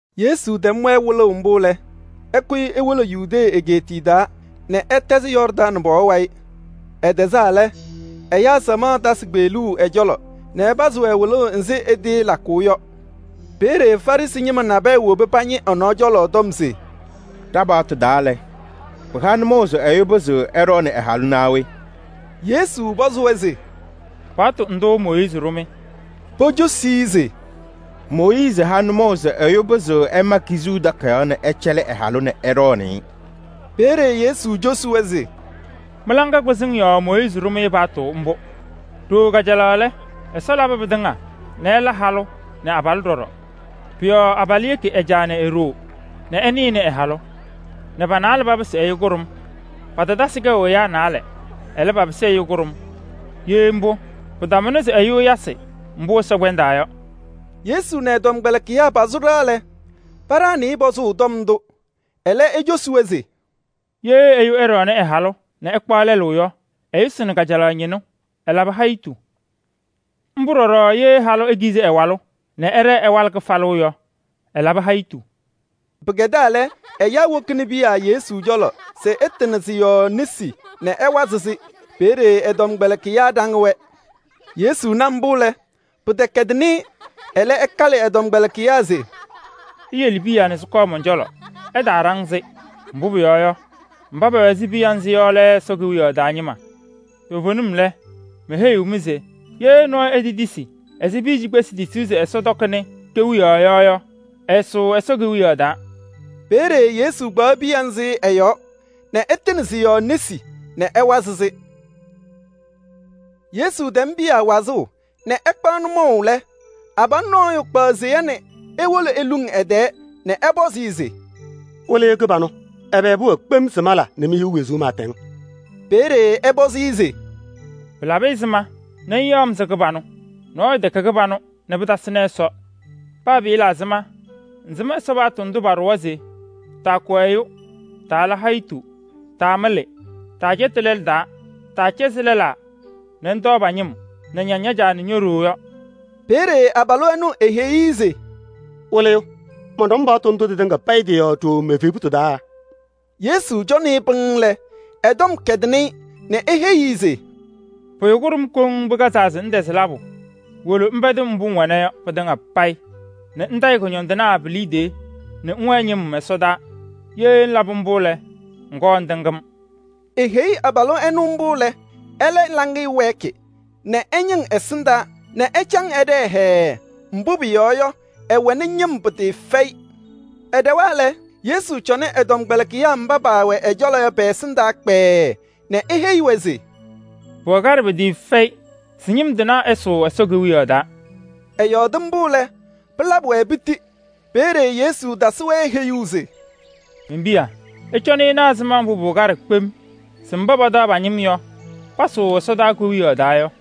Yesu tɛm-wɛ wɩlʋʋ mbʋ lɛ, ɛkʋyɩ ewolo Yudee egeetiye taa nɛ ɛtɛzɩ Yɔɔrdaŋ pɔɔ wayɩ. Ɛtɛzaa lɛ, ɛyaa samaɣ tasɩ kpeɣluu ɛ-cɔlɔ nɛ ɛpazɩ-wɛ wɩlʋʋ ɛzɩ ɛtɩɩlakʋʋ yɔ. Peeye Farɩsɩ ñɩma nabɛyɛ wobi pañɩ ɛ-nɔɔ cɔlɔ tɔm se: “Ɖa-paɣtʋ taa lɛ, pɩha nʋmɔʋ se ɛyʋ pɩzɩɣ ɛɖɔɔnɩ ɛ-halʋ naa we?” Yesu pɔzɩ-wɛ se: “Paɣtʋ ndʋ Mooyiizi ɖʋ-mɩ?” Pocosi-i se: “Mooyiizi ha nʋmɔʋ se ɛyʋ pɩzɩɣ ɛma kizuu takayaɣ nɛ ɛcɛlɩ ɛ-halʋ nɛ ɛɖɔɔnɩ-ɩ.” Peeye Yesu cosi-wɛ se: “Mɩ-laŋa kpɩzɩŋ yɔɔ Mooyiizi ɖʋ-mɩ paɣtʋ mbʋ. Ɖooo kajalaɣ lɛ, Ɛsɔ labɩ pɩtɩŋa nɛ ɛla halʋ nɛ abalʋ ɖɔɖɔ. Pʋ-yɔɔ abalʋ yeki ɛ-caa nɛ e-ɖoo nɛ ɛnɩnɩ ɛ-halʋ nɛ pa-naalɛ papɩsɩ ɛyʋ kʋɖʋm. Patatasɩ kɛʋ ɛyaa naalɛ. Ɛlɛ, papɩsɩ ɛyʋ kʋɖʋm. Ye mbʋ, pɩtamʋnɩ se ɛyʋ ɛyasɩ mbʋ Ɛsɔ kpɛndaa yɔ.” Yesu nɛ ɛ-tɔmkpɛlɩkɩyaa pasʋ ɖɩɣa lɛ, paɖaɣnɩ-ɩ pɔzʋʋ tɔm ndʋ. Ɛlɛ ecosi-wɛ se: “Ye ɛyʋ ɛɖɔɔnɩ ɛ-halʋ nɛ ɛkpaɣ lɛlʋ yɔ, ɛyʋsɩnɩ kajalaɣ ñɩnʋ, ɛlabɩ hayitu. Mbʋ ɖɔɖɔ ye halʋ nɔɔyʋ ekizi ɛ-walʋ nɛ ɛɖɛɛ ɛwalɩ kɩfalʋ yɔ, ɛlabɩ hayitu.” Pɩkɛdaa lɛ, ɛyaa wokini piya Yesu cɔlɔ se ɛtɩnɩ sɩ-yɔɔ nesi nɛ ɛwazɩ sɩ-yɔɔ. Peeye ɛ-tɔmkpɛlɩkɩyaa ɖaŋ-wɛ. Yesu na mbʋ lɛ, pɩtɛkɛdɩnɩ-ɩ, ɛlɛ ɛkalɩ ɛ-tɔmkpɛlɩkɩyaa se: “Iyele piya nɛ sɩkɔɔ mɔn-cɔlɔ, ɩtaaɖaŋ-sɩ. Mbʋ pʋyɔɔ yɔ, mba pɛwɛ ɛzɩ piya nzɩ yɔ lɛ Ɛsɔ Kewiyaɣ taa ñɩma. Toovenim lɛ, meheyiɣ-mɩ se ye nɔɔyʋ etetisi ɛzɩ piya cikpesi tisuu se Ɛsɔ tɔkɩnɩ kewiyaɣ yɔ yɔ, ɛɛsʋʋ Ɛsɔ Kewiyaɣ taa.” Peeye Yesu kpaɣ piya nzɩ ɛ-yɔɔ nɛ ɛtɩnɩ sɩ-yɔɔ nesi nɛ ɛwazɩ sɩ-yɔɔ. Yesu tɛm piya yɔɔ wazʋʋ nɛ ɛkpaɣ nʋmɔʋ lɛ, abalʋ nɔɔyʋ kpaɣ seya nɛ ewolo eluŋ ɛ-tɛɛ nɛ ɛpɔzɩ-ɩ se: “Wɩlɩyʋ kɩbanʋ! Ɛbɛ pʋwɛɛ kpem se mala nɛ mehiɣ wezuu pɩɩtɛŋ?” Peeye ɛpɔzɩ-ɩ se: “Pɩlabɩ ɛzɩma nɛ ŋyaɣ-m se kɩbanʋ? Nɔɔyʋ tɛkɛ kɩbanʋ nɛ pɩtasɩnɩ Ɛsɔ. Paa pɩɩla ɛzɩma, ŋsɩm Ɛsɔ paɣtʋ ndʋ paɖʋwa se: taakʋ ɛyʋ, taala hayitu, taamɩlɩ, taacɛtɩnɩ lɛlʋ taa, taacɛzɩ lɛlaa nɛ ŋtɔɔ pa-ñɩm nɛ ŋña ña-caa nɛ ño-ɖoo yɔ.” Peeye abalʋ ɛnʋ eheyi-i se: “Wɩlɩyʋ! Mɔnɖɔm paɣtʋ ndʋ tɩtɩŋa payɩ tɩ-yɔɔ ɖooo me-evebutu taa.” Yesu cɔnɩ-ɩ pɩŋŋ lɛ, ɛ-tɔm kɛdɩnɩ-ɩ nɛ eheyi-i se: “Pʋyʋ kʋɖʋm koŋ pɩkazaa se ŋtɛzɩ labʋ. Wolo ŋpɛdɩ mbʋ ŋwɛna yɔ pɩtɩŋa payɩ nɛ ŋtayɩ kʋñɔndɩnaa pi-liidiye nɛ ŋwɛnɩ ñɩm ɛsɔdaa. Ye ŋlabɩ mbʋ lɛ, ŋkɔɔ ŋtɩŋ-m.” Eheyi abalʋ ɛnʋ mbʋ lɛ, ɛlɛ laŋɩyɛ wɛɛkɩ nɛ ɛñɩŋ ɛsɩndaa nɛ ɛcaŋ ɛɖɛɛ hɛɛɛ. Mbʋ pʋyɔɔ yɔ, ɛwɛnɩ ñɩm pɩtɩɩfɛyɩ. Ɛɖɛwa lɛ, Yesu cɔnɩ ɛ-tɔmkpɛlɩkɩyaa mba pɛwɛ ɛ-cɔlɔ yɔ pɛ-ɛsɩndaa kpɛɛɛ nɛ eheyi-wɛ se: “Pʋwɛ kaɖɛ pɩtɩɩfɛyɩ se ñɩm tɩnaa ɛsʋʋ Ɛsɔ Kewiyaɣ taa.” Ɛyɔɔdɩ mbʋ lɛ, pɩlabɩ-wɛ piti. Peeye Yesu tasɩ-wɛ heyuu se: “Men-piya, ɩcɔnɩ ɩna ɛzɩma mbʋ pʋwɛ kaɖɛ kpem mba pataɣ pa-ñɩm yɔ se pasʋʋ Ɛsɔ Kewiyaɣ taa yɔ.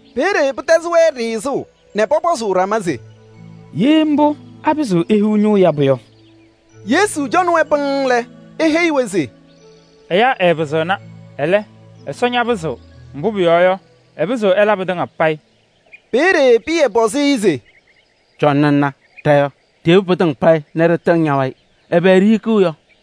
Peeye pɩtɛzɩ-wɛ ɖɩɣzʋʋ nɛ pɔpɔzʋʋ ɖama se: “Ye mbʋ, apɩzɩɣ ehiɣ ñʋʋ yabʋ yɔ?” Yesu cɔnɩ-wɛ pɩŋŋ lɛ, eheyi-wɛ se: “Ɛyaa ɛɛpɩzɩɣna, ɛlɛ, Ɛsɔ ñapɩzɩɣ, mbʋ pʋyɔɔ yɔ, ɛpɩzɩɣ ɛla pɩtɩŋa payɩ.” Peeye Pɩyɛ pɔzɩ-ɩ se: “Cɔnɩ ŋna, ɖa yɔ, ɖiyebi pɩtɩŋa payɩ nɛ ɖɩtɩŋ ña-wayɩ, ɛbɛ ɖihikiɣ yɔ?”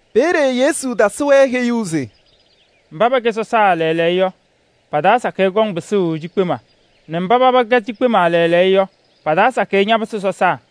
Peeye Yesu tasɩ-wɛ heyuu se: “Mba pɛkɛ sɔsaa lɛɛlɛɛyɔ yɔ, pa-taa sakɩyɛ kɔŋ pɩsʋʋ cikpema nɛ mba paba kɛ cikpema lɛɛlɛɛyɔ yɔ, pa-taa sakɩyɛ ñapɩsɩ sɔsaa.”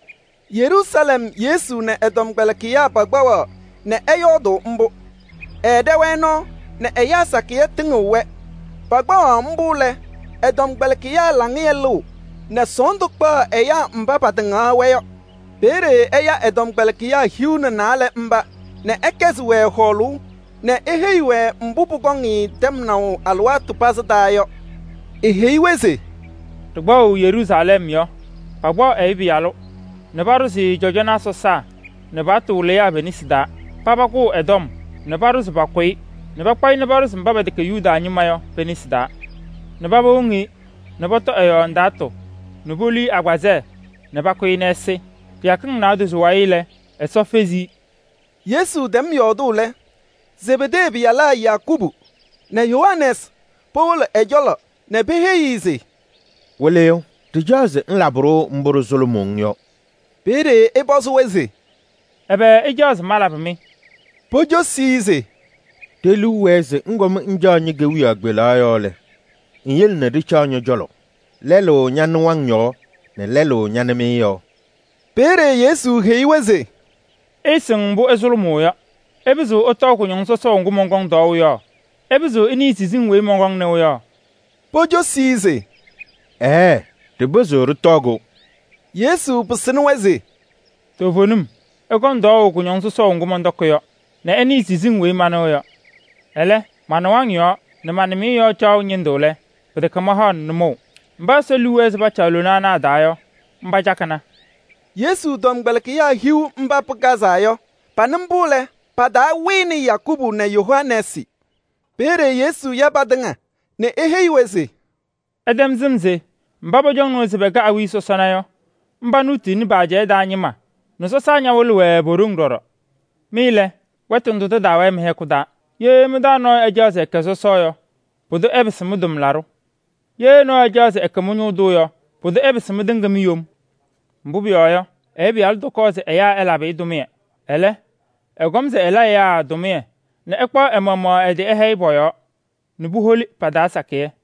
Yeruusalɛm Yesu nɛ ɛ-tɔmkpɛlɩkɩyaa pakpaɣaɣ nɛ ɛyɔɔdʋʋ mbʋ. Ɛɛɖɛ-wɛ nɔɔ nɛ ɛyaa sakɩyɛ tɩŋɩɣ-wɛ. Pakpaɣaɣ mbʋ lɛ, ɛ-tɔmkpɛlɩkɩyaa laŋɩyɛ lɩɣ nɛ sɔɔndʋ kpaɣ ɛyaa mba patɩŋaɣ-wɛ yɔ. Peeye ɛya ɛ-tɔmkpɛlɩkɩyaa hiu nɛ naalɛ mba nɛ ɛkɛzɩ-wɛ hɔɔlʋʋ nɛ eheyi-wɛ mbʋ pʋkɔŋ-ɩ tɛmnaʋ alɩwaatʋ pazɩ taa yɔ. Eheyi-wɛ se: “Ɖɩkpaɣʋ Yeruusalɛm yɔ, pakpaɣ Ɛyʋ Pɩyalʋ nɛ paɖʋzɩ-ɩ cɔjɔnaa sɔsaa nɛ paɣtʋ wɩlɩyaa pe-nesi taa. Paba kʋʋ ɛ-tɔm nɛ paɖʋ se pakʋ-ɩ nɛ pakpaɣ-ɩ paɖʋzɩ mba pɛtɛkɛ Yuda ñɩma yɔ pe-nesi taa nɛ paba woŋ-i nɛ pɔtɔ ɛ-yɔɔ ndaatʋ nɛ polu-i agbazɛɛ nɛ pakʋ-ɩ nɛ ɛsɩ. Kɩyakɩŋ naadozo wayɩ lɛ, Ɛsɔ fezi-i.” Yesu tɛm yɔɔdʋʋ lɛ, Zebedee pɩyalaa Yakubu nɛ Yohanɛɛsɩ powolo ɛ-cɔlɔ nɛ peheyi-i se: “Wɩlɩyʋ, ɖɩcaɣ se ŋlabɩ-ɖʋ mbʋ ɖɩsʋlʋmʋʋ-ŋ yɔ.” Peeye ɛpɔzɩ-wɛ se: “Ɛbɛ ɩcaɣ se malabɩ-mɩ?” Pocosi-i se: “Ɖe-liu wɛɛ se ŋkɔm ŋcaɣ ñe-kewiyaɣ kpelaɣ yɔɔ lɛ, ŋyele nɛ ɖɩcaɣ ñɔ-cɔlɔ: lɛlʋ ña-nɩwaŋ yɔɔ nɛ lɛlʋ ña-nɩmɩyɛ yɔɔ.” Peeye Yesu heyi-wɛ se: “Ɩɩsɩŋ mbʋ ɩsʋlʋmʋʋ yɔ. Ɩpɩzɩɣ ɩtɔɔ kʋñɔŋ sɔsɔʋ ŋgʋ mɔnkɔŋ tɔɔʋ yɔ? Ɩpɩzɩɣ ɩnɩɩ siziŋ weyi mɔnkɔŋ nɩʋ yɔ?” Pocosi-i se: “Ɛɛɛ! Ɖɩpɩzɩɣ ɖɩtɔɔ-kʋ.” Yesu pɩsɩnɩ-wɛ se: “Toovenim ɩkɔŋ tɔɔʋ kʋñɔŋ sɔsɔʋ ŋgʋ mɔntɔkɩ yɔ nɛ ɩnɩɩ siziŋ weyi manɩɣ yɔ. Ɛlɛ, ma-nɩwaŋ yɔɔ nɛ ma-nɩmɩyɛ yɔɔ caɣʋ ñɩndʋ lɛ, pɩtɛkɛ mahaɣnɩ nʋmɔʋ. Mba Ɛsɔ liu wɛɛ se pacaɣ lona ana a-taa yɔ, mba cakɩna.” Yesu tɔmkpɛlɩkɩyaa hiu mba pɩkazaa yɔ, paba nɩ mbʋ lɛ, pa-taa wɩnɩ Yakubu nɛ Yohanɛɛsɩ. Peeye Yesu ya patɩŋa nɛ eheyi-wɛ se: “Ɩtɛm sɩm se mba pɔcɔŋnɩ-wɛ se pɛkɛ awiya sɔsɔna yɔ, mba nuutuuni pa-ajɛɛ taa ñɩma nɛ sɔsaa ñawɩlɩɣ-wɛ po-ɖoŋ ɖɔɖɔ. Mɩ lɛ, wɛtʋ ndʋ tɩtaawɛɛ mɩ-hɛkʋ taa. Ye mɩ-taa nɔɔyʋ ɛcaɣ se ɛkɛ sɔsɔ yɔ, pʋdʋ ɛpɩsɩ mɩ-tʋmlaɖʋ. Ye nɔɔyʋ ɛcaɣ se ɛkɛ mɩ-ñʋʋ tʋ yɔ, pʋdʋ ɛpɩsɩ mɩtɩŋa mi-yom. Mbʋ pʋyɔɔ yɔ, Ɛyʋ Pɩyalʋ tɔkɔɔ se ɛyaa ɛlabɩ-ɩ tʋmɩyɛ. Ɛlɛ, ɛkɔm se ɛla ɛyaa tʋmɩyɛ nɛ ɛkpaɣ ɛ-maɣmaɣ ɛ-tɩ ɛhɛyɩ pɔ-yɔɔ nɛ puholi pa-taa sakɩyɛ.”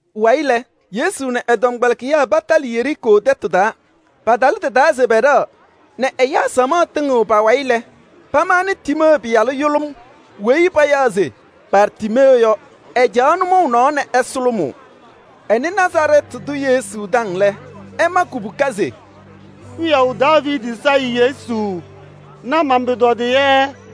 Pʋwayɩ lɛ, Yesu nɛ ɛ-tɔmkpɛlɩkɩyaa patalɩ Yeriikoo tɛtʋ taa. Palɩ tɩ-taa se pɛɖɛɣ nɛ ɛyaa samaɣ tɩŋɩɣ pa-wayɩ lɛ, pamaɣnɩ Tiimee pɩyalʋ yʋlʋm weyi payaɣ se Bartiimee yɔ. Ɛcaɣ nʋmɔʋ nɔɔ nɛ ɛsʋlʋmʋʋ. Ɛnɩ Nazarɛɛtɩ tʋ Yesu taŋ lɛ, ɛma kubuka se: “Wiyaʋ Daaviidi Sayɩ Yesu! Na man-pʋtɔdɩyɛ.”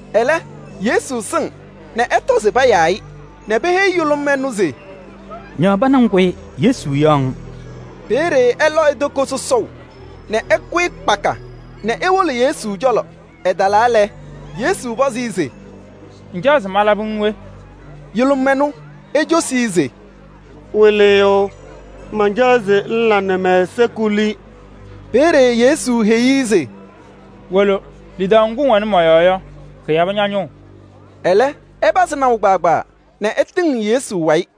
Ɛlɛ, Yesu sɩŋ nɛ ɛtɔ se payaa-ɩ, nɛ peheyi yʋlʋm ɛnʋ se: “Ñaɣ pana ŋkʋyɩ, Yesu yaɣ-ŋ.” Peeye ɛlɔ e-toko sɔsɔʋ nɛ ɛkʋyɩ kpaka nɛ ewolo Yesu cɔlɔ. Ɛtalaa lɛ, Yesu pɔzɩ-ɩ se: “Ŋcaɣ se malabɩ-ŋ we?” Yʋlʋm ɛnʋ ecosi-i se: “Wɩlɩyʋ, mancaɣ se ŋla nɛ mɛ-ɛza kuli.” Peeye Yesu heyi-i se: “Wolo, lidaʋ ŋgʋ ŋwɛnɩ mɔ-yɔɔ yɔ, kɩyabɩ ña-ñʋʋ.” Ɛlɛ, ɛtɩpazɩ naʋ nɛ ɛtɩŋɩɣ Yesu wayɩ.